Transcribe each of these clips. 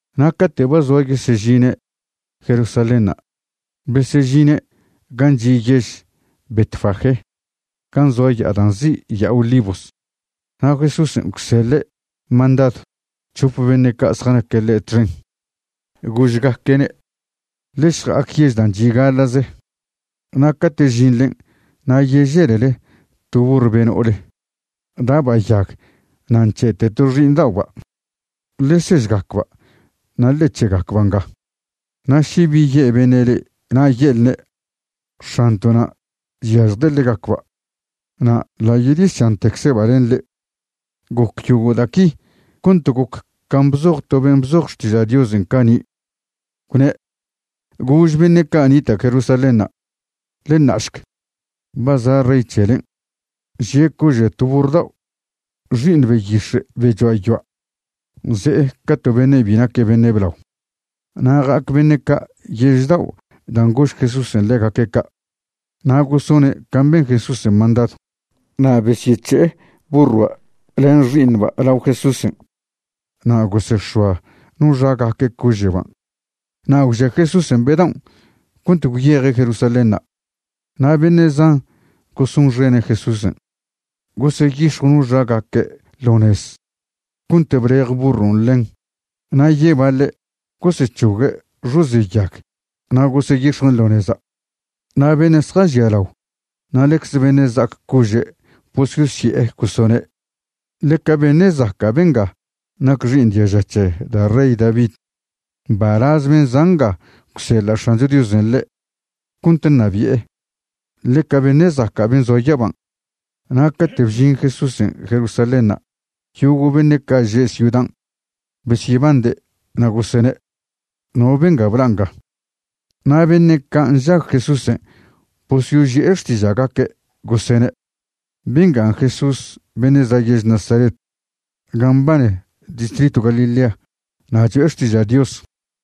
Na' cate' ba zoa yesežine' Jerusalénṉa' besežine' gan' chi' yež Betfagé, gan' zoa ya'a dan' nzi' Ya'a Olivos. Na' Jesúsen' gwseḻe' mandadw c̱hope beṉe' ca' zjanaque' ḻe' txen, gožgaque'ne': ―Ḻe šja'ac yež dan' chi' gaḻa'ze, na' cate' žinḻen' na' yeželele to burr be no'ole da'ba' yag na' nc̱he'te to xi'iṉda'oba'. Ḻe sežgacba' na' ḻe c̱he'gacba' nga. Na' še bi ye' beṉe' le'e na' ye'lne': “X̱anto'na' chyažjde' ḻegacba'.” Na' ḻa' yedyesantecze'ba' len le'e. Goc yogo' da' qui cont goc can' bzoj to ben' bzoj Xtiža' Diosen' cani', gwne': Gož beṉe' ca' nita' Jerusalénṉa': “Ḻe ṉa'šc, ba za' rey c̱helen', žie' cože' to burr dao', xi'iṉ beyix̱e' be choa' yoa'. Ze'e ca to beṉe' bi naque' beṉe' blao. Na' ja'ac beṉe' ca' yež dao' dan' gož Jesúsen' ḻegaque' ca', na' gosone' can' ben Jesúsen' mandadw. Na' besyec̱he'e burroa' len xi'iṉba' lao Jesúsen' na' gosex̱oa no xagaque' cože'ban' na' gwžia Jesúsen' be daon' cont gwyeje' Jerusalénṉa'. Na' beṉe' zan gosonxene' Jesúsen' goseyix̱jw no xagaque' ḻo nez cont blej burron' ḻen na' yebaḻe' gosec̱hogue' xoze' yag na' goseyix̱juen' ḻo neza'. Na' beṉe' zjažialao na' ḻecze beṉe' za'ac cože' bososye'e gosene': ―¡Ḻeca beṉe' zaca' benga nac xi'iṉ diaža c̱he da' rey David! ¡Mbalaz ben' za' nga gwseḻa' X̱ancho Diosen' ḻe' cont ṉabi'e! ¡Ḻeca beṉe' zaca' ben' zoa yaban'! Na' cate' bžin Jesúsen' Jerusalénṉa' yogo' beṉe' ca' že' ciudan' besyebande', na' gosene': ―¿No benga bla' nga? Na' beṉe' ca' nžag Jesúsen' bosyoži'e xtiža'gaque' gosene': ―Bengan' Jesús beṉe' za' yež Nazaret gan' mbane distritw Galilea na' cho'e xtiža' Dios.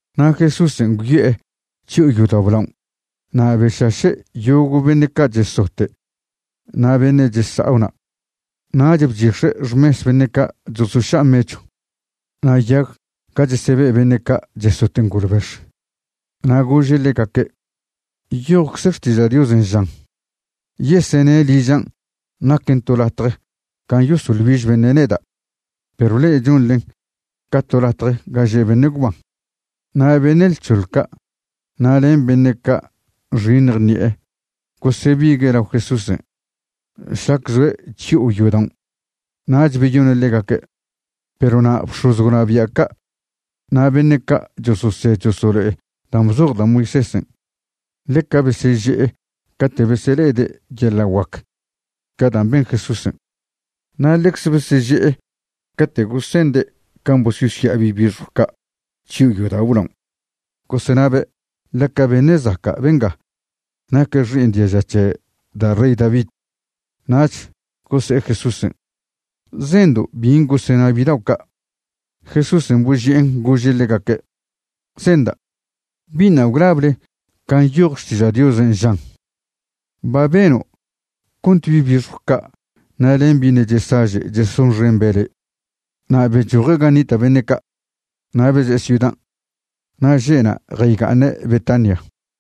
Na' Jesúsen' gwyo'e chyo'o yodao' blaon' na' bešaše' yogo' beṉe' ca' chesote' na' beṉe' chesa'o na'. Nach bchix̱e' xmes beṉe' ca' chosoša' mechw, na' yag ga chesebe' beṉe' ca' chesote' ngolbex. Na' gože' ḻegaque': ―Nyojcze Xtiža' Diosen' žan: “Yesene' ližan' naquen to latje gan' yesoḻ güiž beṉe' neda'”, perw le'e chonḻen ca to latje ga že' beṉe' gwban. Na' beṉe' lc̱hoḻ ca' na' len beṉe' ca' nxiṉj ṉi'e gosebigue' lao Jesúsen' šlac zoe' chyo'o yodaon'. Nach beyone' ḻegaque'. Perw na' bx̱oz gwnabia' ca' na' beṉe' ca' chososed chosolo'e dan' bzoj da' Moisésen' ḻeca beseže'e cate' besele'ede' yeḻa' guac ca' dan' ben Jesúsen'. Na' ḻecze beseže'e cate' gosende' can' bososya'a bi' bixjw ca' chyo'o yodao' blaon', gosenabe': “Ḻeca beṉe' zaca' benga nac xi'iṉ diaža c̱he da' rey David.” Nach gose'e Jesúsen': ―¿Zendo' bin' gosena bidao' ca'? Jesúsen' boži'en gože' ḻegaque': ―Zenda'. ¿Biṉa' gwlable can' nyoj Xtiža' Diosen'?, žan: Ba beno' cont bi' bixjw ca' na' len bi' ṉe' chesaže' chesonxembe' le'. Na' bechoje' gan' nita' beṉe' ca' na' beze'e ciudan'. Na' že'na' jayga'aṉe' Betania.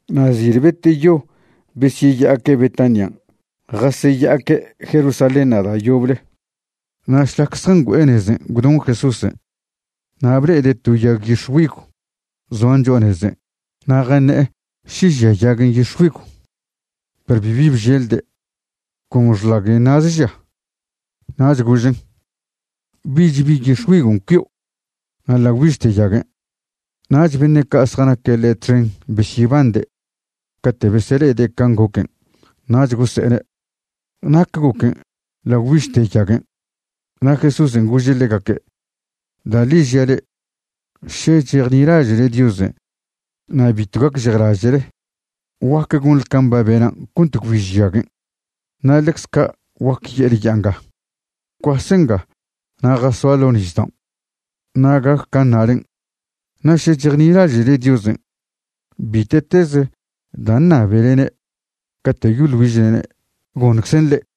Na' zil beteyo besyeya'aque' Betanian' jaseya'aque' Jerusalénṉa' da' yoble. Na' šlac zjangüe'e nezen' gwdon Jesúsen'. Na' ble'ede' to yag yix̱güigw zoan cho'a nezen' na' jaṉe'e še žia yaguen' yix̱güigw. Perw bibi bželde', con xḻaguen' na'ze žia. Nach gožen': ―Bich bi yix̱güigon' cuio'. Na' ḻa' gwbižte yaguen'. Nach beṉe' ca' zjanaque' ḻe' txen besyebande' cate' besele'ede' can' goquen', nach gose'ene': ―¿Nac goquen' ḻa' gwbižte yaguen'? Na' Jesúsen' gože' ḻegaque': ―Da' ḻi žia' le'e, še chejnilaže'le Diosen' na' bitw gacžejlaže'le, guaque gonḻe can' ba benan' cont gwbiž yaguen'. Na' ḻecze ca' guac ye'le ya'a nga: “Gwcuase nga na' jasoa ḻo' nisdaon'”, na' gac can' ṉalen'. Na' še chejnilaže'le Diosen', bite'teze dan' ṉabelene' cate' yoḻ güižlene', goṉczen' le'e.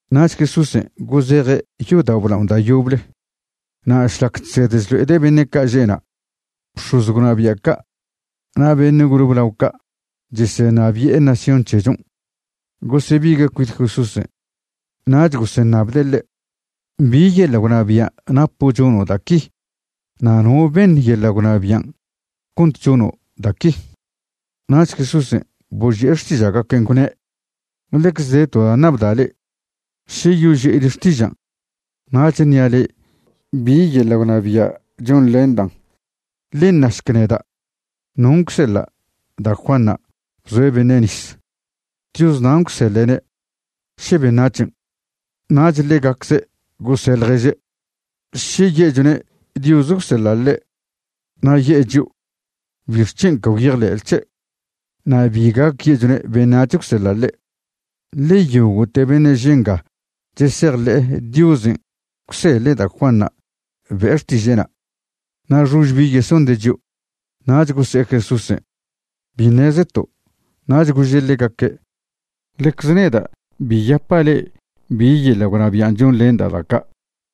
Nach Jesúsen' gozeje' yodao' blaon' da' yoble. Na' šlac chsed chlo'ede' beṉe' ca' že' na', bx̱oz gwnabia' ca' na' beṉe' gole blao ca' chesenabi'e nación c̱hechon' gosebigue' cuit Jesúsen'. Nach goseṉabde' ḻe': ―¿Bi yeḻa' gwnabia' napo' chono' da' qui? ¿No beṉ yeḻa' gwnabian' cont chono' da' qui? Nach Jesúsen' boži'e xtiža'gaquen', gwne': ―Ḻecze de to da' ṉabda' le'e. Še yoži'ile xtižan' nach ṉi'a le'e bi yeḻa' gwnabia' chonḻendan'. Ḻe našc neda': ¿non' gwseḻa' da' Juanṉa' bzoe' beṉe' nis? ¿Dios nan' gwseḻe'ne', še beṉac̱hen'? Nach ḻegacze' gose' ḻježe': ―Še ye'chone' Dios gwseḻa' ḻe', na' ye'e chio': “¿Bixc̱hen' ca gwyejḻe'le c̱he'?” Na' bi gac ye'chone' beṉac̱h gwseḻa' ḻe', ḻe yogo'te beṉe' že' nga chesejḻe'e Diosen' gwseḻe' da' Juanṉa' be'e xtiže'na', na' xož bi yesonde' chio'. Nach gose'e Jesúsen': ―Bi ṉezeto'. Nach gože' ḻegaque': ―Ḻecze neda' bi yapa' le'e bi yeḻa' gwnabian' chonḻenda' da' ca'.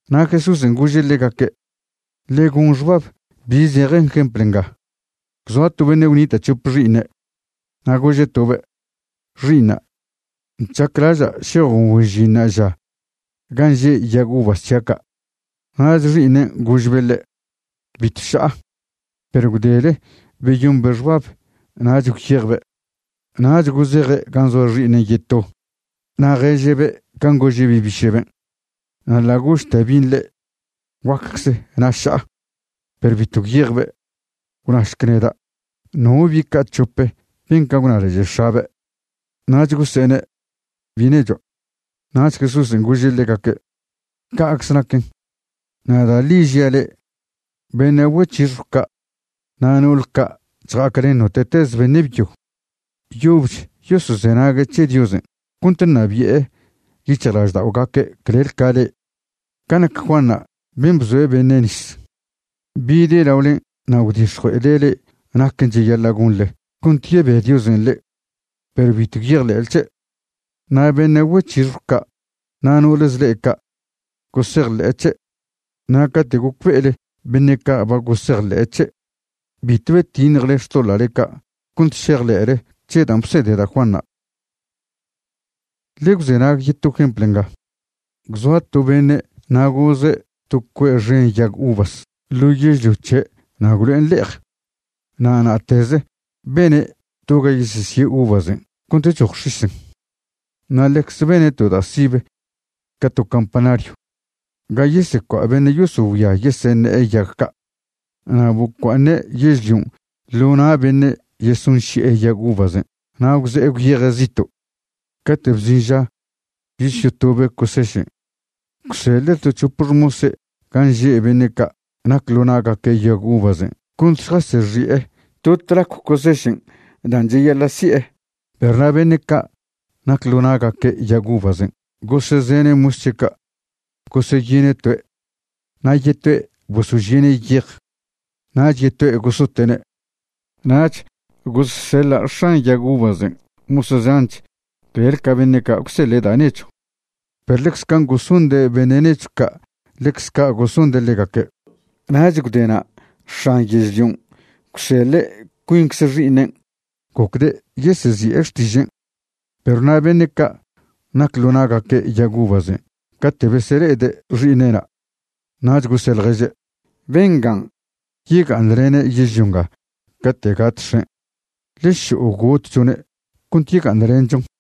Na' Jesúsen' gože' ḻegaque': ―Ḻe gon xbab bi zeje jempl nga: Gwzoa to beṉe' gwnita' c̱hope xi'iṉe'. Na' gože' tobe': “Xi'iṉa', chaclaža' šejo' güen žin ṉa'aža gan' že' yag uvas c̱hia' ca'.” Nach xi'iṉen' gožbe' ḻe': “Bitw ša'a.” Perw gwdele beyombe' xbab nach gwyejbe'. Nach gozeje' gan' zoa xi'iṉen' yeto, na' ježe'be' can' gože' bi' biše'ben'. Na' ḻa' gožte bin' ḻe': “Guaccze, na' ša'a.” Perw bitw gwyejbe'. Gwnašc neda', ¿no bi' ca' c̱hope ben can' gwnalaže' x̱abe'? Nach gose'ene': ―Bi' nechoa'. Nach Jesúsen' gože' ḻegaque': ―Ca'cze naquen. Na' da' ḻi žia' le'e, beṉe' güec̱hixjw ca' na' no'ole ca' chja'aclen note'teze beṉe' byo yobech yosozenague' c̱he Diosen' cont ṉabi'e yic̱hjlažda'ogaque' clel ca le'e. Ca nac Juanṉa' ben' bzoe' beṉe' nis, bide' laolen' na' gwdix̱jue'ede' le'e naquen' cheyaḻa' gonḻe cont yebe Diosen' le'e. Perw bitw gwyejḻe'le c̱he'. Na' beṉe' güec̱hixjw ca' na' no'ole zḻe' ca' gosejḻe'e c̱he'. Na' cate' gocbe'ele beṉe' ca' ba gosejḻe'e c̱he', bitw betiṉjele xtoḻa'le ca' cont šejḻe'le c̱he dan' bsede da' Juanṉa'. ’Ḻe gwzenag yeto jempl nga. Gwzoa to beṉe' na' goze' to cue' xen yag uvas ḻo yežlio c̱he' na' gwlo'en le'ej. Na' na'teze bene' to ga yesesie' uvasen' cont choj x̱isen'. Na' ḻecze bene' to da' sibe ca to campanaryw ga yesecua' beṉe' yosogüia yeseṉe'e yag ca'. ’Na' bcua'aṉe' yežlion' ḻo na' beṉe' yesonši'e yag uvasen' na' gwze'e gwyeje' zito'. Cate' bžin ža yosyotobe' cosešen', gwseḻe' to c̱hope xmose' gan' že' beṉe' ca' nac ḻo na'gaque' yag uvasen' cont šjasyexi'e to tlacw cosešen' dan' cheyaḻa' si'e. Perw na' beṉe' ca' nac ḻo na'gaque' yag uvasen' gosezene' mos c̱he' ca'. Goseyine' toe', na' yetoe' bosožie'ne' yej, nach yetoe' gosote'ne'. Nach gosseḻa' x̱an yag uvasen' mos zanch clel ca beṉe' ca' gwseḻe' da' nechw, perw ḻecze can' gosonde' beṉe' nechw ca', ḻecze ca' gosonde' ḻegaque'. ’Nach gwdena' x̱an yežlion' gwseḻe' cuincze xi'iṉen', gocde' yesezi'e xtižen'. Perw na' beṉe' ca' nac ḻo na'gaque' yag uvasen' cate' besele'ede' xi'iṉe'na', nach gose' ḻježe': “Bengan' yega'aṉlene' yežlio nga cate' gat x̱en'. Ḻe šo'o gotchone' cont yega'aṉlenchon.”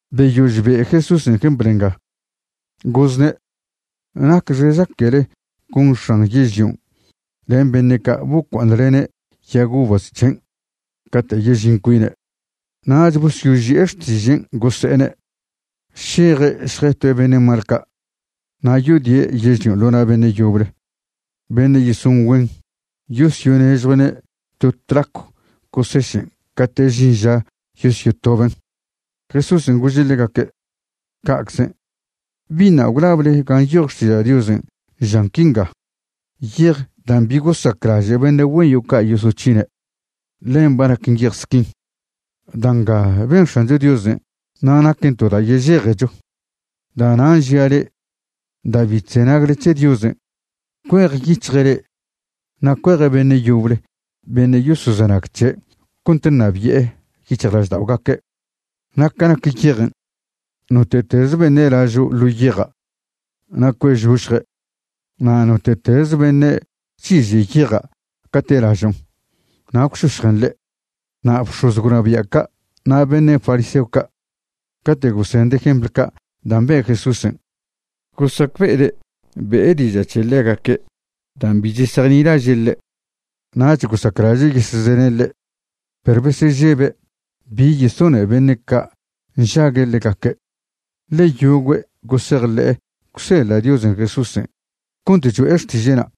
Beyož be' Jesúsen' jempl nga, gozne': ―¿Nacxe chaquele gon x̱an yežlion' len beṉe' ca' bocua'aṉlene' yag uvas c̱hen' cate' yežin cuine'? Nach bosyoži'e xtižen' gosene': ―Šeje' šjetoe' beṉe' mal ca', na' yodie' yežlion' ḻo na' beṉe' yoble beṉe' yeson güen yosyonežjue'ne' to tlacw cosešen' cate' žin ža yosyotoben'. Jesúsen' gože' ḻegaque': ―Ca'czen'. ¿Biṉa' gwlable ga nyoj Xtiža' Diosen', žan quinga?: Yej dan' bi gosaclaže' beṉe' güen yo'o ca' yosoc̱hine', ḻen ba naquen yej squin. Da' nga ben X̱ancho Diosen', na' naquen to da' yežejecho. Da'nan' žia' le'e, da' bi chzenagle c̱he Diosen', cuejyic̱hje' le'e na' cueje' beṉe' yoble beṉe' yosozenag c̱he' cont ṉabi'e yic̱hjlažda'ogaque'. Na' ca nac yejen', note'teze beṉe' lažo' ḻo yeja' na' cue'žošje', na' note'teze beṉe' chiže' yeja' cate' lažon' na' gwšošjen ḻe'. Na' bx̱oz gwnabia' ca' na' beṉe' fariseo ca', cate' gosende' jempl ca' dan' be' Jesúsen', gosacbe'ede' be'e diža' c̱he ḻegaque' dan' bi chesejnilaže' ḻe'. Nach gosaclaže' yesezene' ḻe', perw besežebe' bi yesone beṉe' ca' nžague' ḻegaque', ḻe yogüe' gosejḻe'e gwseḻa' Diosen' Jesúsen' cont cho'e xtiže'na'.